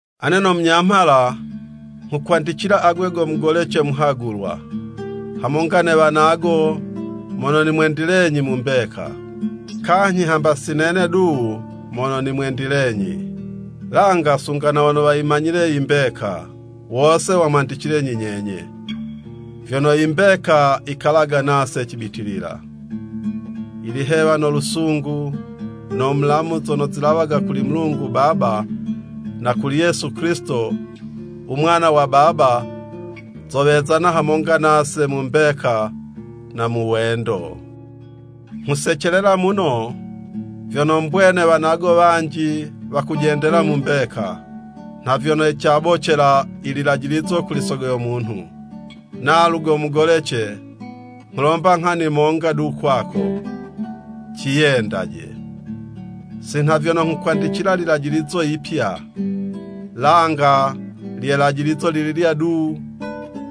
Ane no munyamhala nghukwandicila agwe go mugolece muhagulwa, hamonga ne wanago, mono nimwendilenyi mu mbeka. Kanyhi hamba si nene du mono nimwendilenyi, langa sunga na wono wayimanyile i mbeka, wose wamwendilenyi nyenye, vyono yimbeka yikalaga nase cibitilila. Ilihewa no lusungu no mulamu zono zilawaga kuli Mulungu Baba, na kuli Yesu Kilisito, u Mwana wa Baba, zowezana hamonga nase mu mbeka na mu wendo. Nghusecelela muno vyono mbwene wanago wanji wakujendela mu mbeka, nha vyono cabocela i lilajilizo kuli Sogo yo munhu. Nalu go mugolece, nghulomba nghani monga du kwako, “Ciyendaje.” Si nha vyono nghukwandicila lilajilizo yipya, langa lye 'lajilizo lililya du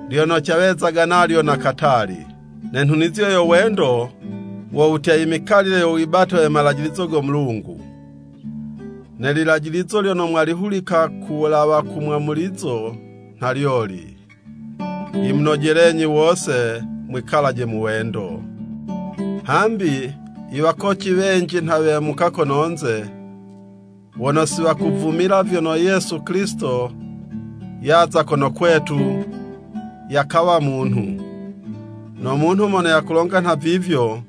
lyono cawezaga nalyo na katali. Ne nhunizo yo wendo, wo wutya, i mikalile yo wibate we malajilizo go Mulungu. Ne lilajilizo lyono mwalihulika ku wulawa u mwamulizo nha lyoli, yimunojelenyi wose mwikalaje mu wendo. Hambi i wakoci wenji nha wemuka kononze wono siwakuvumila vyono Yesu Kilisito yaza kono kwetu yakawa munhu. No munhu mono yakulonga nha vivyo,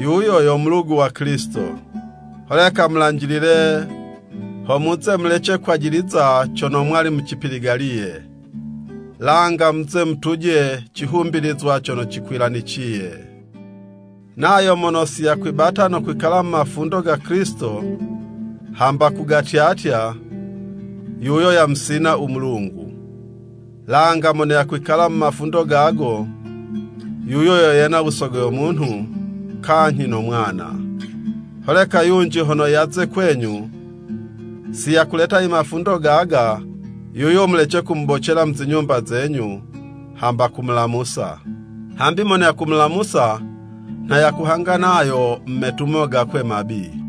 yuyo yo mulugu wa Kilisito. Holeka mulanjilile, ho muze mulece kwajiliza cono mwali mucipiligaliye, langa muze mutuje cihumbilizwa cono cikwilaniciye. Nayo mono siyakwibata no kwikala mu mafundo ga Kilisito hamba kugatyatya, yuyo yamusina u Mulungu. Langa mono yakwikala mu mafundo gago, yuyo yo yena u Sogo yo munhu kanyhi no Mwana. Holeka yunji hono yaze kwenyu, siyakuleta i mafundo gaga, yuyo mulece kumubocela mu zinyumba zenyu, hamba kumulamusa. Hambi mono yakumulamusa nha yakuhanga nayo mu metumo gakwe mabi.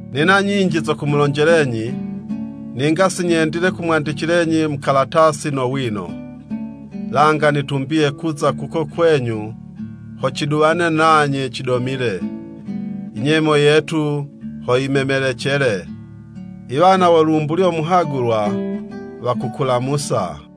Nina nyinji zo kumulonjelenyi, ninga sinyendile kumwandicilenyi mu kalatasi no wino, langa nitumbiye kuza kuko kwenyu ho ciduwane nanye cidomile, i nyemo yetu ho yimemelecele. I wana wo lumbulyo muhagulwa, wakukulamusa.